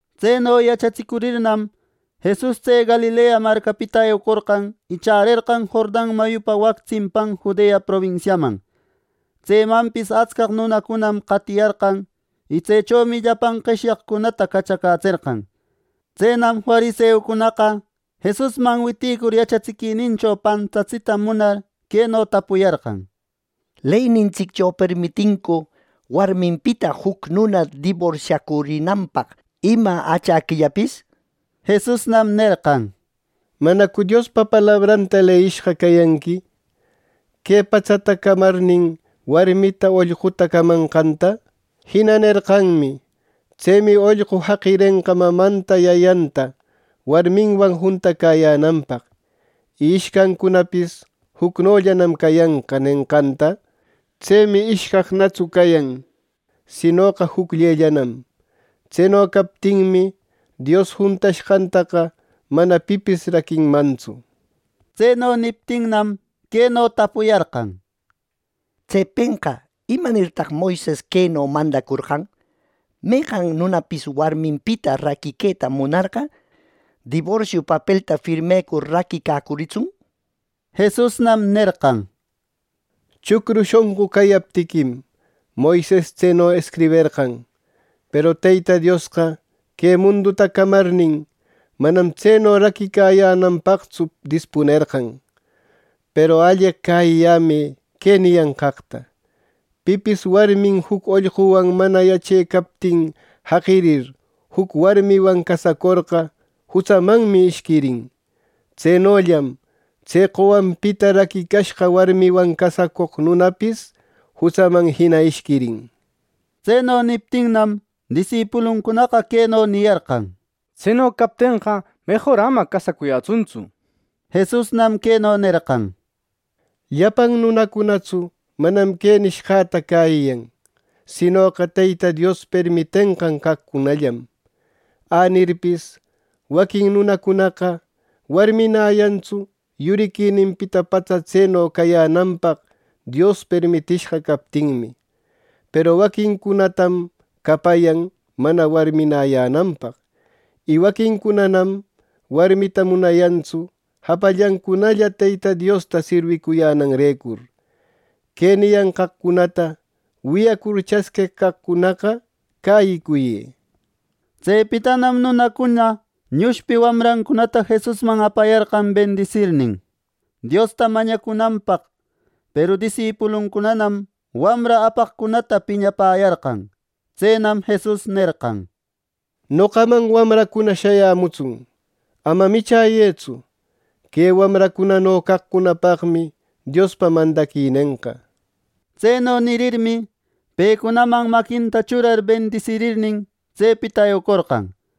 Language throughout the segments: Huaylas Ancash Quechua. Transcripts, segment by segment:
Tseno yachatsicurirnam, Jesus tse Galilea marcapita eucorqan y chärerqan Jordan mayupa wac tsimpan Judea probinsiaman. Tsemanpis atscaq nunacunam qatiyarqan. Y tsechomi llapan qeshyaqcunata cachacätserqan. Tsenam fariseucunaqa, Jesusman witïcur yachatsiquinincho pantatsita munar, queno tapuyarqan: —¿Leynintsiccho permitincu warminpita juc nuna diborsiacurinanpaq ima achäquillapis? —nir. Jesusnam nerqan: —¿Manacu Diospa palabranta leyiyashqa cayanqui ‘que patsata camarnin, warmita ollquta camanqanta’? Jina nerqanmi: ‘Tsemi, ollqu jaqirenqa mamanta yayanta warmiwan juntacäyänanpaq. Y ishcancunapis jucnollanam cayanqa’ nenqanta. Tsemi ishcaqnatsu cayan, sinoqa jucllellanam. Tseno captinmi, Dios juntashqantaqa mana pipis raquinmantsu. Tseno niptinnam, queno tapuyarqan: —Tsepenqa, ¿imanirtaq Moises queno mandacorqan: ‘Meqan nunapis warminpita raquiqueta munarqa, diborsio papelta firmecur raquicacuritsun?’ —nir. Jesusnam nerqan: —Chucru shonqu cayaptiquim, Moises tseno escriberqan; peru Teyta Diosqa que munduta camarnin, manam tseno raquicayänanpaqtsu dispunerqan. Peru alleq cäyiyämë que niyanqaqta: Pipis warmin juc ollquwan mana yachecaptin jaqirir, juc warmiwan casacorqa jutsamanmi ishquirin. Tsenollam tse qowanpita raquicashqa warmiwan casacoq nunapis jutsaman jina ishquirin —nir. Tseno niptinnam, disipuluncunaqa queno niyarqan: —Tseno captenqa, mejor ama casacuyätsuntsu. Jesusnam queno nerqan: —Llapan nunacunatsu manam que nishqäta cäyiyan, sinoqa Teyta Dios permitenqan caqcunallam. Änirpis waquin nunacunaqa warminäyantsu, yuriquininpita patsa tseno cayänanpaq Dios permitishqa captinmi. Peru waquincunatam capayan mana warminäyänanpaq. Y waquincunanam warmita munayantsu japallancunalla Teyta Diosta sirwicuyänanrecur. Que niyanqaqcunata wiyacur chasqueq caqcunaqa cäyicuyë. Tsepitanam nunacuna ñushpi wamrancunata Jesusman apayarqan bendisirnin, Diosta mañacunanpaq; peru disipuluncunanam wamra apaqcunata piñapäyarqan. Tsenam Jesus nerqan: —¡Noqaman wamracuna shayämutsun! ¡Ama michäyëtsu! Que wamracunano caqcunapaqmi Diospa mandaquinenqa. Tseno nirirmi, pecunaman maquinta churar bendisirirnin, tsepita eucorqan.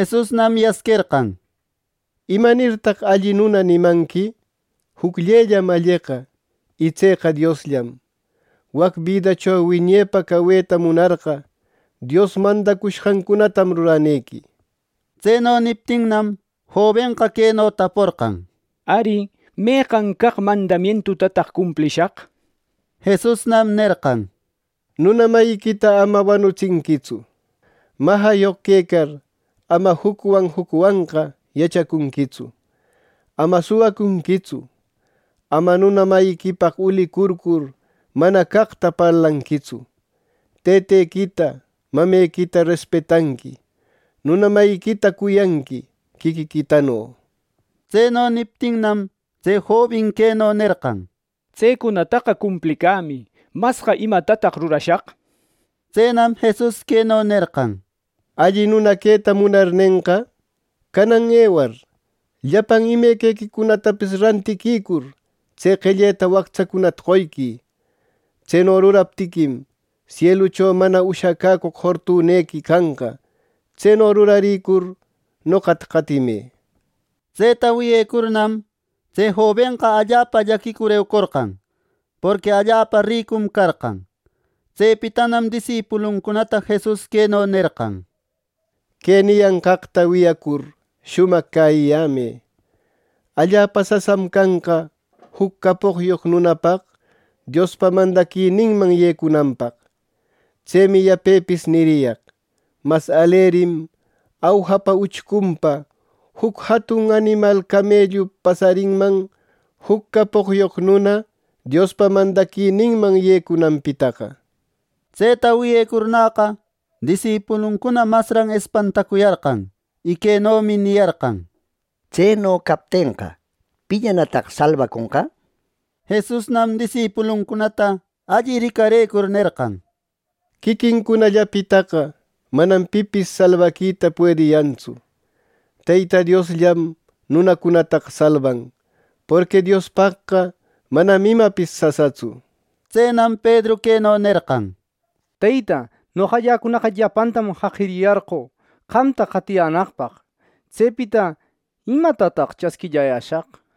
Jesusnam yasquerqan: —¿Imanirtaq alli nuna nimanqui! Jucllellam alleqa, y tseqa Diosllam. Wac bidacho wiñepa caweta munarqa, Dios mandacushqancunatam ruranequi. Tseno niptinnam, jobenqa queno taporqan: —Ari, ¿meqan caq mandamientutataq cumplishaq? —nir. Jesusnam nerqan: —‘Nuna mayiquita ama wanutsinquitsu. Majayoq quecar, ama jucwan jucwanqa yachacunquitsu. Ama suwacunquitsu. Ama nuna mayiquipaq ulicurcur mana caqta parlanquitsu. Tëtequita, mamequita respetanqui. Nuna mayiquita cuyanqui quiquiquitano’ —nir. Tseno niptinnam, tse jobin queno nerqan: —Tsecunataqa cumplicämi. ¿Masqa imatataq rurashaq? —nir. Tsenam Jesus queno nerqan: —Alli nuna queta munarnenqa, canan ewar llapan imequicunatapis rantiquicur, tse qelleta wactsacunata qoyquï. Tseno ruraptiquim, sielucho mana ushacäcoq fortunequi canqa. Tseno rurarïcur, noqata qatimë. Tseta wiyecurnam, tse jobenqa allapa llaquicur eucorqan; porqui allapa ricum carqan. Tsepitanam disipuluncunata Jesus queno nerqan: —Que niyanqaqta wiyacur shumaq cäyiyämë: Allapa sasam canqa juc capoqyoq nunapaq Diospa mandaquininman yecunanpaq. Tsemi yapepis niriyaq: ¡Mas alerim awjapa uchcunpa juc jatun animal camellu pasarinman, juc capoqyoq nuna Diospa mandaquininman yecunanpitaqa! Tseta wiyecurnäqa, disipuluncuna masran espantacuyarqan, y quenomi niyarqan: —Tseno captenqa, ¿pillanataq salbaconqa! —nir. Jesusnam disipuluncunata alli ricarëcur nerqan: —Quiquincunallapitaqa manam pipis salbaquita puediyantsu; Teyta Diosllam nunacunataqa salban, porqui Diospaqqa manam imapis sasatsu —nir. Tsenam Pedru queno nerqan: —Teyta, noqalläcunaqa llapantam jaqiriyarqö, qamta qatiyänaqpaq. Tsepita ¿Imatataq chasquillayäshaq? —nir.